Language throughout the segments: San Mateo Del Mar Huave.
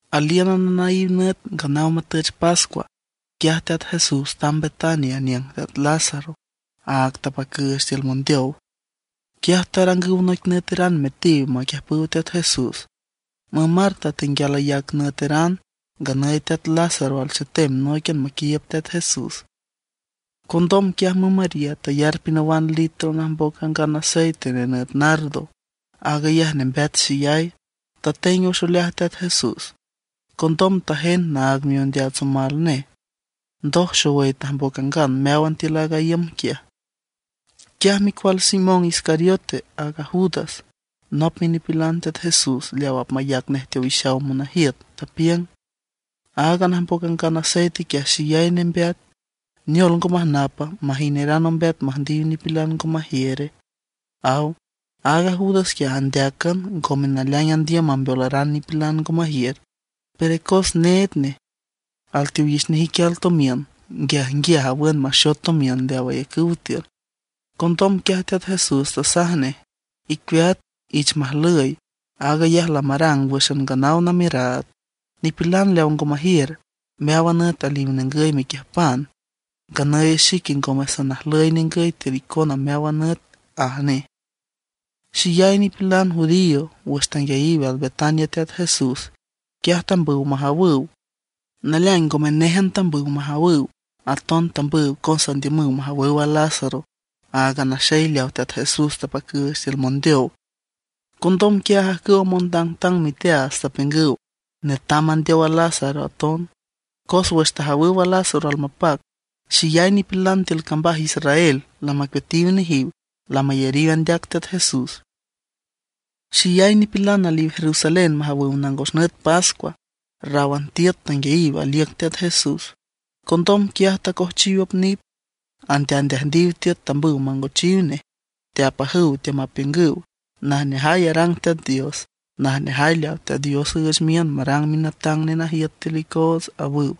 Alíünan anaíw nüt nganaw matüch pascua, quiaj Teat Jesús tamb Betania aniüng teat Lázaro, áag tapacüüch tiül mondeow. Quiaj tarangüw noic nüeteran metiw maquiüjpüw Teat Jesús. Müm Marta tenguial ayac nüeteran, nganüy teat Lázaro alchetem nóiquian maquiiüb Teat Jesús. Condom quiaj müm María tayar pinawan litro najmboc angan aceite nenüt nardo, aag ayaj nembeat xeyay. Tateng wüx oleaj Teat Jesús, condom tajend naag miondeats omal nej. Ndoj xowüy tajmboc angan meáwan tiül aaga iüm quiaj. Quiaj micual Simón Iscariote, aaga Judas, nop minipilan Teat Jesús leaw apmayac nej teowixaw monajiüt, tapiüng: ―Aaga najmboc angan aceite quiaj xeyay nembeat. ¿Neol ngo majnapa, majineran ombeat müjndiw nipilan ngo majiüre? ―aw. Aaga Judas quiaj andeácan, ngome naleaing andiüm mambeolaran nipilan ngo majiür, pero cos need nej. Alteowix nej iquial tomiün, nguiajnguiaj awün maxot tomiün leaw ayacüw tiül. Condom quiaj Teat Jesús tasaj nej: ―Icueat, ich majlüy. Aag ayaj lamarang wǘxan nganaw namiüraad. Nipilan leaw ngo majiür, meáwan nüt aliw ningüy mequiüjpan; nganüy xique ngome sanajlüy ningüy tiül icona meáwan nüt ―aj nej. Xeyay nipilan judío wüx tanguiayiw al Betania Teat Jesús, quiaj tambüw majawüw. Naleaing ngome néjan tambüw majawüw; aton tambüw cos andiümüw majawüw a Lázaro, aaga naxey leaw Teat Jesús tapacüüch tiül mondeow. Condom quiaj ajcüwa montangtang miteaats tapiüngüw netam mandeow a Lázaro aton; cos wüx tajawüw Lázaro almapac, xeyay nipilan tiül cambaj Israel lamacueatiw nejiw, lamayariw andeac Teat Jesús. Xeyay nipilan aliw Jerusalén majawüw nangos nüt pascua. Ráwan tiüt tanguiayiw aliüc Teat Jesús. Condom quiaj tacojchiw op nit, andeaandeajndiw tiüt tambüw mangochiw nej. Teapajüw teamapiüngüw: ―¡Najneajay arang Teat Dios! ¡Najneajay leaw Teat Dios üüch miün marang Minatang Nenajiüt tiül icoots! ―awüw.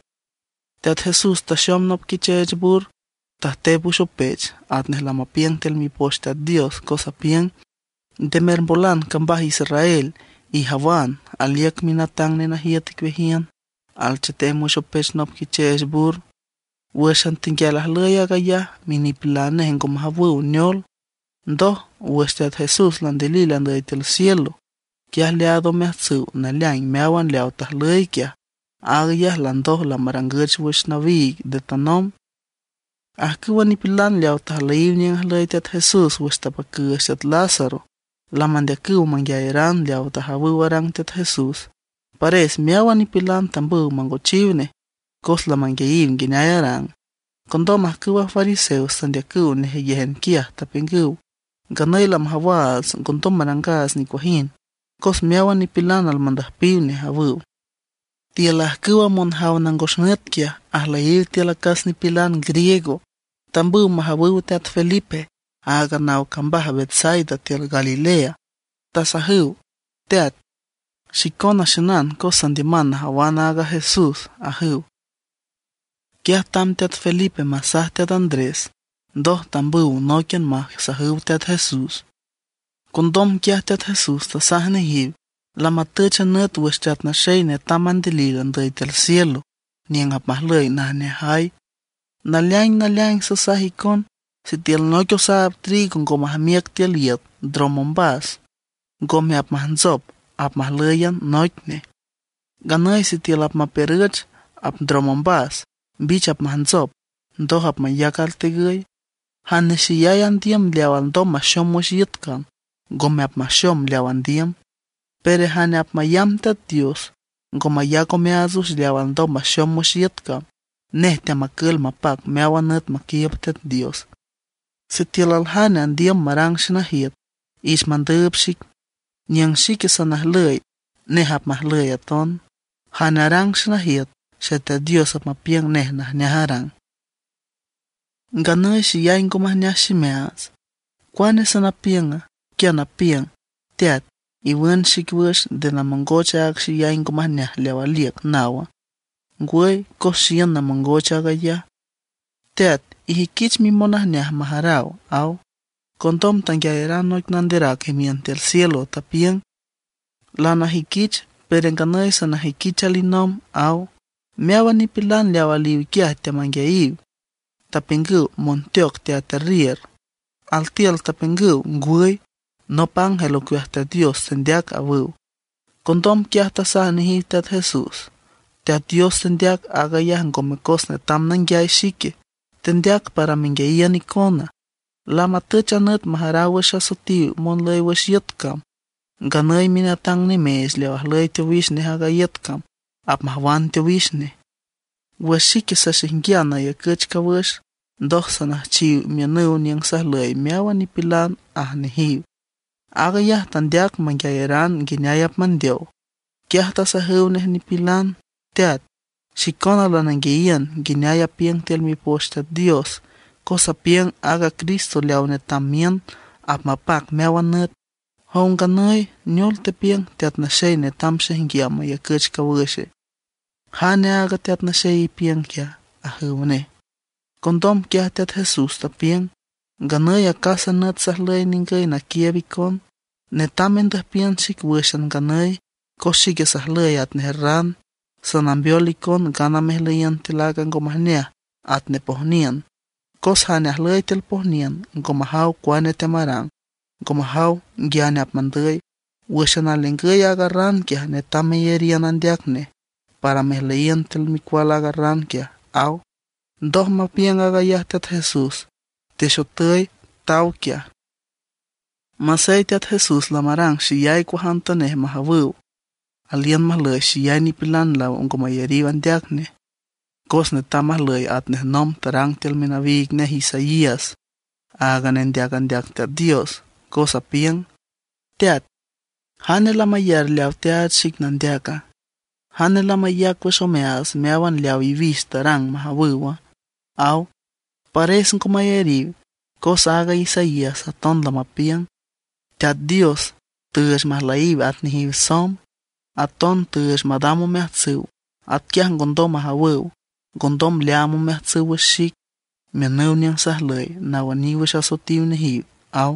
Teat Jesús taxom nop quicheech bur; tajtep wüx opech atnej lamapiüng tiül Mipoch Teat Dios, cos apiüng: Nde mermbolan cambaj Israel; ijawan, aliüc Minatang Nenajiüt icueajiün, alchetem wüx opech nop quicheech bur. Wǘxan tenguial ajlüy aag ayaj minipilan nej ngo majawüw neol. Ndoj, wüx Teat Jesús landilil andüy tiül cielo, quiaj leaad omeajtsüw naleaing meáwan leaw tajlüy quiaj; aag ayaj landoj lamarangüch wüx nawiig nde tanomb. Ajcüwa nipilan leaw tajlüyiw niüng ajlüy Teat Jesús wüx tapacüüch teat Lázaro, lamandeacüw manguiayaran leaw tajawüw arang Teat Jesús. Pares meáwan nipilan tambüw mangochiw nej cos lamanguiayiw nguineay arang. Condom ajcüwa fariseos tandeacüw nejeyéjan quiaj, tapiüngüw: ―Nganüy lamajawaats ngondom marangaats nicuajind cos meáwan nipilan almandüjpiw nej ―awüw. Tiül ajcüwa monjaw nangos nüt quiaj, ajlüyiw tiül acas nipilan griego. Tambüw majawüw teat Felipe, aaga naw cambaj Betsaida tiül Galilea. Tasajüw: ―Teat, xicona xiünan cos sandiüman najawan aaga Jesús ―ajüw. Quiaj tamb teat Felipe masaj teat Andrés, ndoj tambüw nóiquian masajüw Teat Jesús. Condom quiaj Teat Jesús tasaj nejiw: ―Lamatüch a nüt wüx Teat Naxey netam mandilil andüy tiül cielo, niüng apmajlüy najneajay. Naleaing naleaing sasaj icon, sitiül noic osaab trigo ngo majmiüc tiül iüt ndrom ombas, ngome apmajntsop, apmajlǘyan noic nej. Nganüy sitiül apmapiürüch, apndrom ombas, mbich apmajntsop, ndoj apmayac altegüy. Jane xeyay andiüm leaw alndom maxom wüx iüt cam, ngome apmaxom leaw andiüm. Pero jane apmayamb Teat Dios, ngo mayac omeaats wüx leaw alndom maxom wüx iüt cam, nej teamacül mapac meáwan nüt maquiiüb Teat Dios. Sitiül aljane andiüm marang xenajiüt, ich mandüüb xic. Niüng xique sanajlüy, nej apmajlüy aton. Jane arang xenajiüt, Xeteat Dios apmapiüng nej najneaj arang. ’Nganüy xeyay ngo majneaj ximeaats. ¿Cuane sanapiüng? ¿Quia napiüng: “Teat, iwün xic wüx, nde namongoch aaga xeyay ngo majneaj leaw aliüc”, nawa? Ngwüy, cos xiün namongoch aag ayaj. Teat, ijüiquich mimonajneaj majaraw ―aw. Condom tanguiayaran noic nanderac imiün tiül cielo, tapiüng: ―Lanajüiquich, pero nganüy sanajüiquich alinomb ―aw. Meáwan nipilan leaw aliw quiaj teamanguiayiw, tapiüngüw monteoc teaterriür; altiül tapiüngüw: ―Ngwüy, nop ángel ocueaj Teat Dios tendeac ―awüw. Condom quiaj tasaj nejiw Teat Jesús: ―Teat Dios tandeac aag ayaj ngome cos netam nanguiay xique; tandeac para menguiayiün icona. Lamatüch a nüt majaraw wüx asoetiw monlüy wüx iüt cam; nganüy minatang nimeech leaw ajlüy teowix nej aaga iüt cam apmajwan teowix nej. Wüx xique saxaijnguian nayacüch cawüx, ndoj sanüjchiw miünüw niüng sajlüy meáwan nipilan ―aj nejiw. Aag ayaj tandeac manguiayaran nguineay apmandeow. Quiaj tasajüw nej nipilan: ―Teat, xicona lananguiayiün nguineay apiüng tiül Mipoch Teat Dios, cos apiüng aaga Cristo leaw netam miün apmapac meáwan nüt. Jow nganüy, ¿neol tepiüng Teat Naxey netam xaijnguiam mayacüch cawüxe? ¿Jane aaga Teat Naxey ipiüng quiaja? ―ajüw nej. Condom quiaj Teat Jesús tapiüng: ―Nganüy acásan nüt sajlüy ningüy naquiiüb icon. Netam mendüjpiün xic wǘxan nganüy, cos xique sajlüy atnej ran. Sanambeol icon ngana mejlüyiün tiül aaga ngo majneaj atnej pojniün; cos jane ajüy tiül pojniün ngo majaw cuane teamarang, ngo majaw nguiane apmandüy. Wǘxan alningüy aaga ran quiaj, netam meyariün andeac nej para mejlüyiün tiül micual aaga ran ―aw. Ndoj mapiüng aag ayaj Teat Jesús, texotüy taw quiaj. Masey Teat Jesús lamarang xeyay cuajantanej majawüw, aliün majlüy xeyay nipilan leaw ngo mayariw andeac nej; cos netam majlüy atnej nomb tarang tiül minawiig nej Isaías, aaga nendeac andeac Teat Dios, cos apiüng: Teat, ¿jane lamayar leaw teaach xic nandeaca? ¿Jane lamayac wüx omeaats meáwan leaw iwix tarang majawüwa? aw. Pares ngo mayariw, cos aaga Isaías aton lamapiüng: Teat Dios tüüch majlüyiw at nejiw somb. Aton tüüch madam omeajtsüw. Atquiaj ngondom majawüw. Ngondom leaam omeajtsüw wüx xic, miünüw niüng sajlüy nawüniw wüx asoetiw nejiw, aw.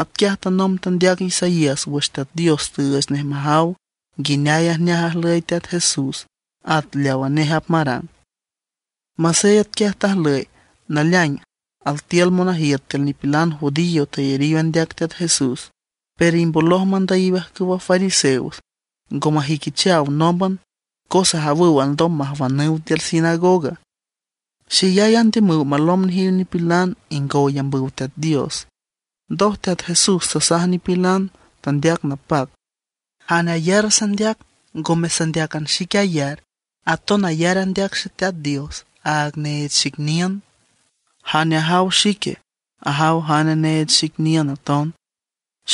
Atquiaj tanomb tandeac Isaías wüx Teat Dios tüüch nej majaw nguineay ajneaj ajlüy Teat Jesús, at leawa nej apmarang. Masey atquiaj tajlüy, naleaing altiül monajiüt tiül nipilan judío tayariw andeac Teat Jesús. Pero imboloj mandüyiw ajcüwa fariseos, ngo majüiquichaw nómban, cos ajawüw alndom majwanüw tiül sinagoga. Xeyay andiümüw malomb nejiw nipilan ingow ayambüw Teat Dios. Ndoj Teat Jesús tasaj nipilan, tandeac napac: ―Jane ayar sandeac ngome sandeácan xique ayar, aton ayar andeac Xeteat Dios, aaga neech xic niün. Jane ajaw xique, ajaw jane neech xic niün aton.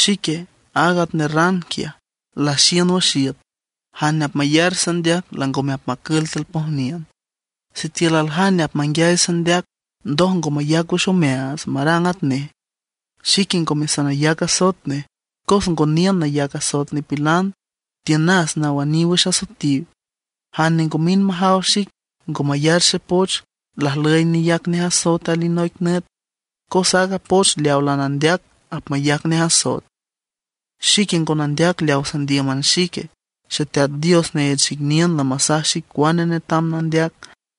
Xique, aag atnej ran quiaj, laxiün wüx iüt; jane apmayar sandeac langome apmacül tiül pojniün. Sitiül aljane apmanguiay sandeac, ndoj ngo mayac wüx omeaats marang atnej, xique ngome sanayac asoet nej, cos ngo niün nayac asoet nipilan; tiünas nawüniw wüx asoetiw. Jane ngo mind majaw xic, ngo mayar xepoch, lajlüy neyac nej asoet alinoic nüt, cos aaga poch leawa lanandeac apmayac nej asoet. Xique ngo nandeac leaw sandíüman xique. Xeteat Dios neech xic niün lamasaj xic cuane netam nandeac,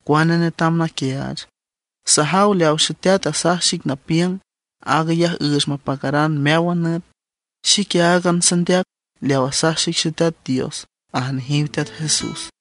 cuane netam naquiaach. Sajaw leaw Xeteat asaj xic napiüng, aag ayaj üüch mapacaran meáwan nüt. Xique áagan sandeac, leaw asaj xic Xeteat Dios ―aj nejiw Teat Jesús.